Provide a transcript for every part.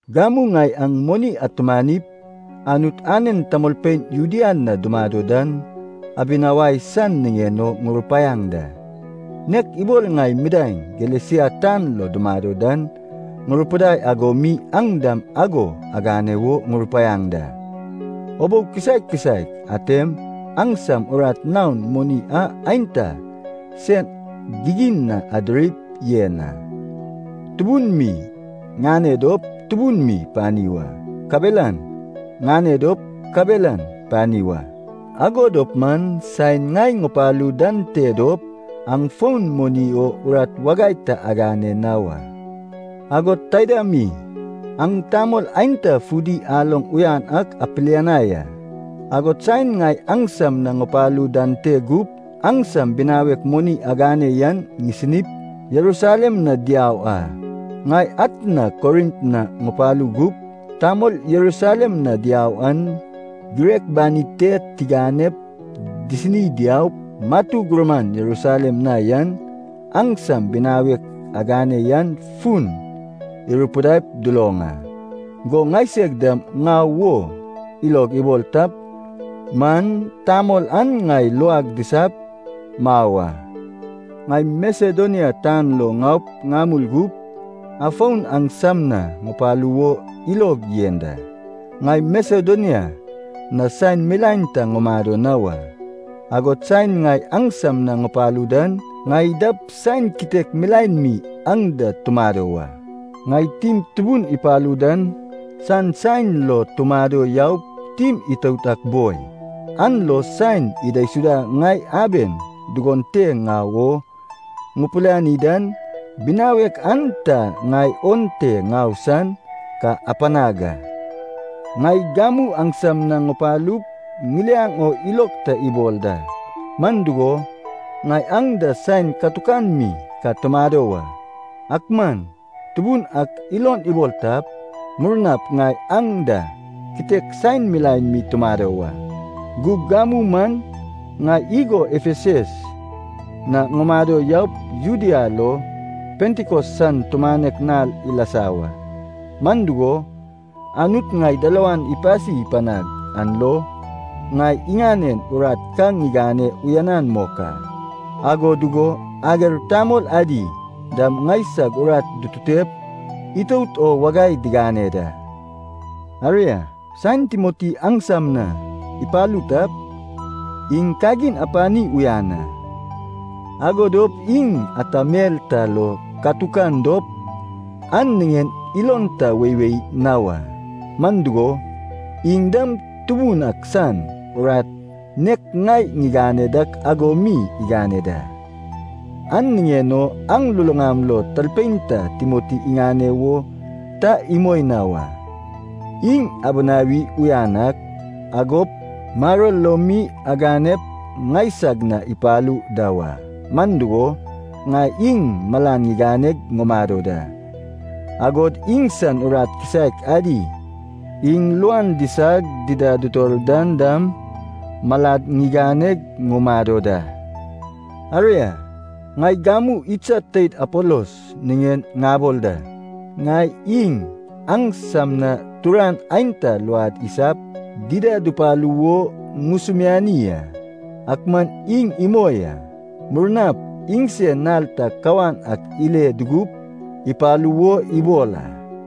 Gamu ŋai aŋ moni atumanip Anut anen tamolpein Judea na dumado dan abinawai san niŋen o ŋurupaiaŋ da. Nek ibol ŋai midaeŋ Galesia tan lo dumado dan ŋurupidai ago mi aŋ dam ago agane wo ŋurupaiaŋ da. Ubou kisaek kisaek atem aŋsam urat naon moni an aenta sen gigin na adirip yen a. Tubun mi ŋane dop tubun mi pani wa, kabelan ŋane dop kabelan pani wa. Ago dop man saen ŋai ŋupalu dan te dop, aŋ fon moni o urat wagai ta agane na wa. Agod taida mi, aŋ tamol aenta fudi aloŋ uyan ak apilianai a, agod saen ŋai aŋsam na ŋupalu dan te gup, aŋsam binawek moni agane yan disinip Jerusalem na diau a. Ŋai atna Korint na ŋupalu gup, tamol Jerusalem na diau an, girek banid te tiganep disini diaup, matu gurman Jerusalem na yan, aŋsam binawek agane yan fun irupidaip duloŋ a. Go ŋaiseg dam ŋau wo ilog ibol tap man tamol an ŋai luag disap mau a. Ŋai Masedonia tan lo ŋaup ŋamul gup, afon aŋsam na ŋupalu wo ilog yen da. Ŋai Masedonia na saen milaen ta ŋumado na wa. Agod saen ŋai aŋsam na ŋupalu dan, ŋai dap saen kitek milaen mi aŋ da tumado wa. Ŋai tim tubun ipalu dan san saen lo tumado yaup tim itout ak boi. An lo saen idaisudap ŋai aben dugon te ŋau o ŋupiliani dan, binawek an ta ŋai onte ŋau san ka apanag a. Ŋai gamu aŋsam na ŋupalup ŋiliaŋ o ilog ta ibol da, man dugo, ŋai aŋ da saen katukan mi ka tumado wa. Ak man Tubun ak ilon ibol tap, murnap ŋai aŋ da kitek saen milaen mi tumado wa. Gug gamu man ŋai igo Efesas na ŋumado yaup Judea lo Pentikos san tumanek nal ilasa wa. Man dugo, Anut ŋai dalawan ipasi panag an lo, ŋai iŋanen urat ka ŋigane uyanan mok a. Ago dugo ager tamol adi dam ŋaisag urat dututep itout o wagai digane da. Aria, saen Timoti aŋsam na ipalu tap, iŋ kagin apani uyan a, ago dop iŋ ata mel ta lo katukan dop, an niŋen ilon ta weiwei na wa. Man dugo, iŋ dam Tubun ak san urat nek ŋai ŋigane dak ago mi igane da. An niŋen o aŋ luluŋam lo talpein ta Timoti iŋane wo ta imoi na wa. Iŋ abinawi uyan ak, agop maror lo mi aganep ŋaisag na ipalu da wa. Man dugo, ŋai iŋ malan ŋiganeg ŋumado da, agod iŋsan urat kisaek adi iŋ luan disag dida dutor dan dam malad ŋiganeg ŋumado da. Aria, ŋai gamu idsad teid Apolos niŋen ŋabol da. Ŋai iŋ aŋsam na turan aenta luad isap dida dupalu wo ŋusumiani a, ak man iŋ imoi a. Murnap iŋsen nal ta kawan ak ile dugup ipalu wo ibol a.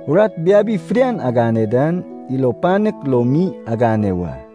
Urat biabi fidian agane dan ilo panek lo mi agane wa.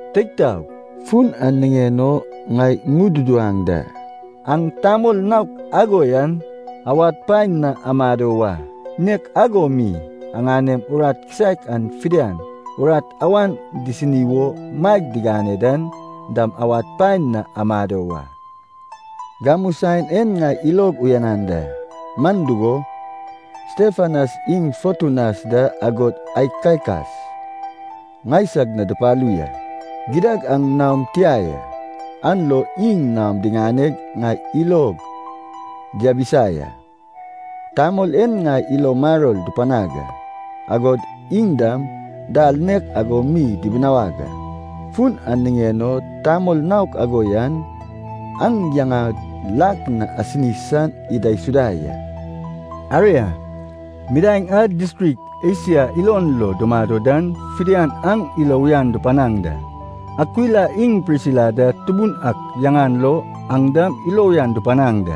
Teig taog, fun an niŋen ŋai ŋududuwaŋ da, aŋ tamol naok ago yan awad paen na amado wa Nek ago mi aŋanem urat kisaek a fidian urat awan disini wo maeg digane dan dam awad paen na amado wa. Gamu saen en ŋai ilog uyanan da, man dugo, Stefanas iŋ Fotunatas da agod Akaikas ŋaisag na dupalu ya. Gidad aŋ naom tia ya, an lo iŋ naom diŋaneg ŋai ilog diabisa ya. Tamol en ŋai ilo maror dupanag a, agod aŋ dam dal nek ago mi dibinawaŋ a. Fun an niŋen o tamol naok ago yan, aŋ yaŋad lak na asini san idaisuda ya. Aria, midaeŋ a distrik Esia ilon lo dumado dan fidian aŋ ilo uyan dupanaŋ da. Akwila iŋ Prisila da Tubun ak yaŋan lo aŋ dam ilo uyan dupanaŋ da.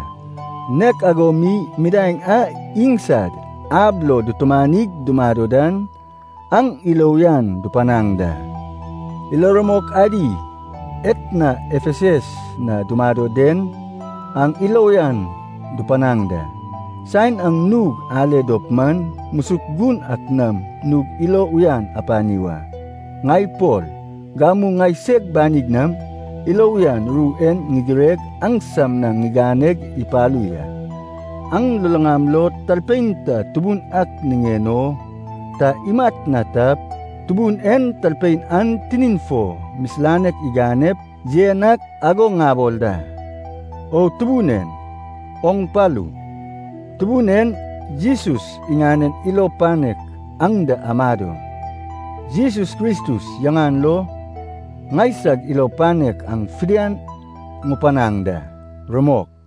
Nek ago mi midaeŋ a iŋsad ab lo dutumanig dumado dan, aŋ ilo uyan dupanaŋ da. Ilo rumok adi etna Efesas na dumado den, aŋ ilo uyan dupanaŋ da. Saen aŋ nug ale dop man, musuk gun ak nam nug ilo uyan apani wa. Ŋai Pol, gamu ŋaiseg banig nam ilo uyan ru en ŋigireg aŋsam na ŋiganeg ipalu ya. Aŋ luluŋam lo talpein ta Tubun ak niŋen o ta imat na tap, Tubun en talpein an tinin fo misilanek iganep yen ak ago ŋabol da. O Tubun en, oŋ palu! Tubun en Jesus iŋanen ilo panek aŋ da amado. Jesus Kristus yaŋan lo ŋaisag ilo panek aŋ fidian ŋupanaŋ da. Rumok.